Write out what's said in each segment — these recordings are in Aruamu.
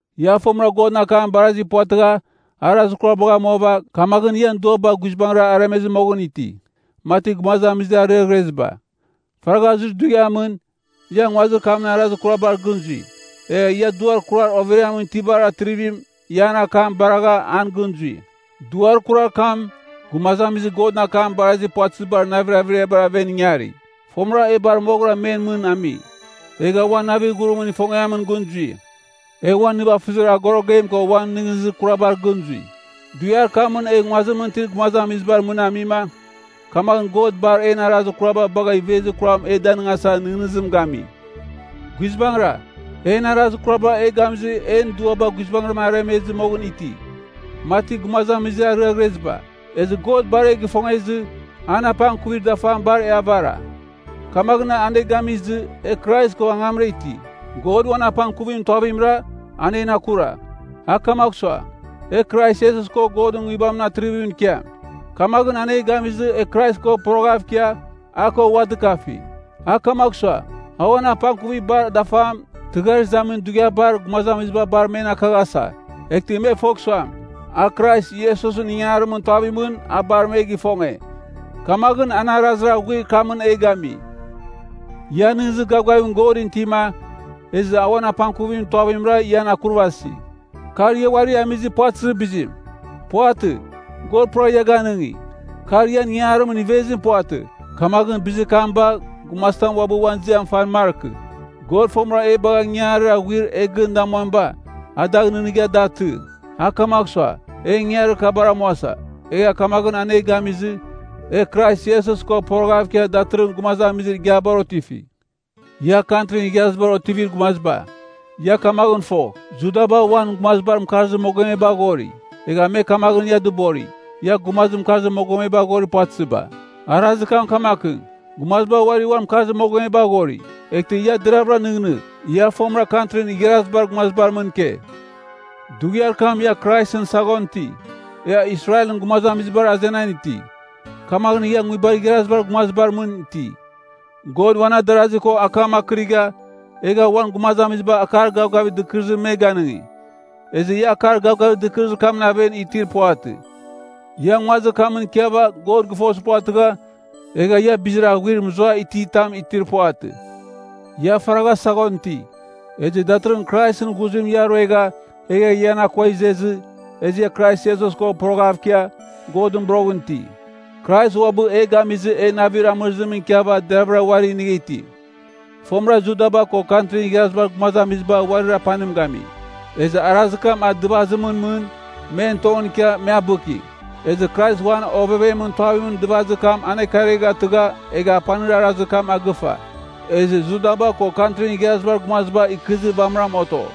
Ia fomɨra Godɨn akam barazi puvatɨgha arazir kurabagh amuava, kamaghɨn ian duaba guizbangɨra aremezɨ moghɨn iti, mati gumazamizir ariaghreziba. Faragha zuir dughiamɨn, ia nguazir kamɨn arazir kurabar gɨn zui. Egha ia duar kurar overiamɨn itibar atrivim, ia an akam baregha an gɨn zui. Duar kurar kam, gumazamizir Godɨn akam barazi puvatɨzibar navir averiabar aven ingari. Fomɨra e bar moghɨra men mɨn ami, egha uan navir ghurimɨn ifongiamɨn gɨn zui. E uan nivafɨzir agorogem ko uan nɨghnɨzir kurabar gɨn zui. Dughiar kamɨn e nguazimɨn itir gumazamizibar mɨn amima, kamaghɨn God bar en arazir kuraba bagh ivezir kuram e danɨngasa nɨghnɨzim gami. Guizbangɨra, en arazir kuraba e gamizɨ en duaba guizbangɨra aremezɨ moghɨn iti, mati gumazamizir ariaghreziba. Ezɨ God bar e gɨfongezɨ, an apangkuvir dafam bar e avara. Kamaghɨn an e gamizɨ e Krais ko angamra iti. God uan apangkuvimɨn tuavimra, a en akura. A kamagh sua, e Krais Iesus ko Godɨn Nguibamɨn atrivimɨn ikiam. Kamaghɨn an e gamizɨ e Krais ko poroghav ikia, a ko ua dɨkafi. A kamagh sua, a uan apangkuvir bar dafam, tɨghar izamin dughiabar gumazamiziba bar men akaghasa. Eghtɨ me fogh suam, a Krais Iesusɨn ingangarimɨn tuavimɨn a bar me gifonge. Kamaghɨn an arazir aghuir kamɨn e gami. Ia nɨghnɨzir gavgavim Godɨn itima, ezɨ a uan apangkuvimɨn tuavimra ian akurvasi. Kar ia uari amizir puvatɨzir bizim. Puvatɨ. God pura ia ganɨngi. Kar ian ingarimɨn ivezim puvatɨ. Kamaghɨn bizir kam bagh gumazitam uabɨ uan ziam fan markɨ. God fomɨra e bagha, ingangarir aghuir e gɨn damuamiba, a dagh nɨghnɨgha da atɨ. A kamagh sua, e ingangarir kabar amuasa, egha kamaghɨn an e gamizɨ, e Krais Iesus ko poroghav ikia datɨrɨghɨn gumazamizir igiabar otifi. Ia Kantrin Igharazibar otivir gumaziba, ia kamaghɨn fo, Judaba, uan gumazibar mɨkarzir mogomebar aghori. Egha me kamaghɨn ia dɨbori, ia gumazir mɨkarzir mogomebar aghorir puvatɨziba. Arazir kam kamakɨn, gumaziba uari uan mɨkarzir mogomebar aghori. Eghtɨ ia deravɨra nɨghnɨgh, ia fomɨra Kantrin Igharazibar Gumazibar mɨn ike. Dughiar kam ia Kraisɨn saghon iti. Ia Israelɨn gumazamizibar azenan iti, kamaghɨn ia nguibar igharazibar gumazibar mɨn iti. God uan adarasi ko akam akɨrigha, egha uan gumazamiziba akar gavgavir dɨkɨrɨzim me ganɨngi. Ezɨ ia akar gavgavir dɨkɨrɨzir kamɨn aven itir puvatɨ. Ia nguazir kamɨn ikiava God gɨfozir puvatɨgha, egha ia bizir aghuir mɨzuai iti tam itir puvatɨ. Ia faragha saghon iti, ezɨ datɨrɨghɨn Kraisɨn ghuzim ia ruegha egha ian akua izezɨ, ezɨ ia Krais Iesus ko poroghav ikia, Godɨn boroghɨn iti. Krais uabɨ e gamizɨ e navir amɨrɨzim ikiava deravɨra uari inigha iti. Fomɨra Judaba ko Kantrin Igharazibar Gumazamiziba uarir apanim gami. Ezɨ arazir kam a divazimɨn mɨn men tongɨn ikia me abɨki. Ezɨ Krais uan ovevemɨn tuavimɨn divazir kam anekariaghatɨgha egha apanir arazir kam agɨfa. Ezɨ Judaba ko Kantrin Igharazibar Gumaziba ikɨzir vamɨram oto.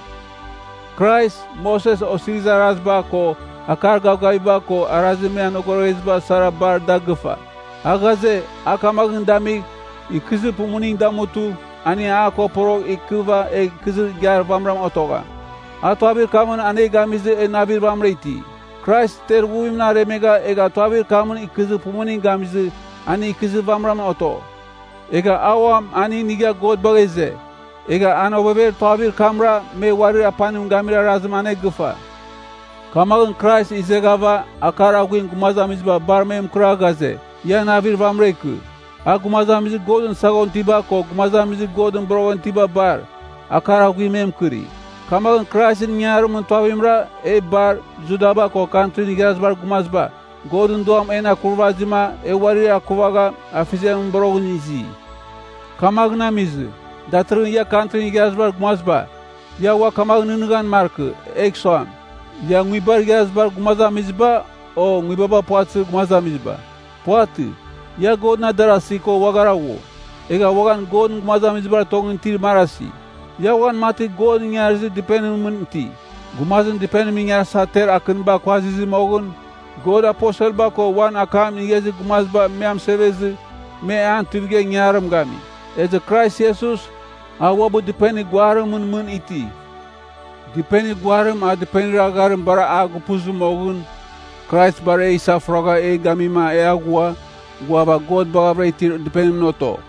Krais, Moses Osirizir Araziba, ko akar gavgaviba, ko arazir me anogorogheziba sara bar da gɨfa. A ghaze, a kamaghɨn damigh, ikɨzir pumuning damutɨ, aning a ko porogh ikɨva egh ikɨzir igiar vamɨran otogham. A tuavir kamɨn an e gamizɨ e navir vamɨra iti. Krais ter ighuvimɨn aremegha egha tuavir kamɨn ikɨzir pumuning gamizɨ aning ikɨzir vamɨran oto. Egha uam aning inigha God bagha ize. Egha an ovever tuavir kamra me uarir apanim gamir arazim anegɨfa. Kamaghɨn Krais izeghava akar aghuim gumazamiziba bar me mɨkɨra ghaze, ia navir vamɨra ikɨ. A, gumazamizir Godɨn saghon itiba ko gumazamizir Godɨn boroghɨn itiba bar, akar aghuim me mɨkɨri. Kamaghɨn Kraisɨn ingangarimɨn tuavimra e bar, Judaba ko Kantrin Igharazibar Gumaziba, Godɨn Duam en akurvazima e uari akuvagha Afeziamɨn boroghɨn izi. Kamaghɨn amizɨ, datɨrɨghɨn ia Kantrin Igharazibar Gumaziba, ia ua kamaghɨn nɨghnɨghan markɨ egh suam, ia nguibar igharazibar gumazamiziba o nguibaba puvatɨzir gumazamiziba. Puvatɨ. Ia Godɨn adarasi ko uaghara ghu, egha uaghan Godɨn gumazamizibar tongɨn itir marasi. Ia uaghan mati God ingarizir dɨpenimɨn mɨn iti. Gumazim dɨpenim ingarasa ter akɨniba kuazizɨ moghɨn, God aposelba ko uan akam inigha izir gumaziba me amɨsevezɨ me an tuivigha ingangarim gami. Ezɨ Krais Iesus, a uabɨ dɨpenir guarimɨn mɨn iti. Dipenir guarim a dɨpenir agharim bar a gupuzɨ moghɨn, Krais bar e isafuragha e gamima e aghua, ghuava God baghavɨra itir dɨpenimɨn oto.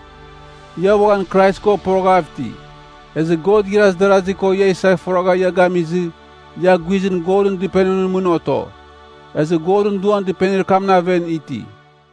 Ia uaghan Krais ko poroghav iti, ezɨ God igharaz darazi ko ia isafuragha ia gamizɨ, ia guizɨn Godɨn Dɨpenimɨn mɨn oto. Ezɨ Godɨn Duam dɨpenir kamɨn aven iti.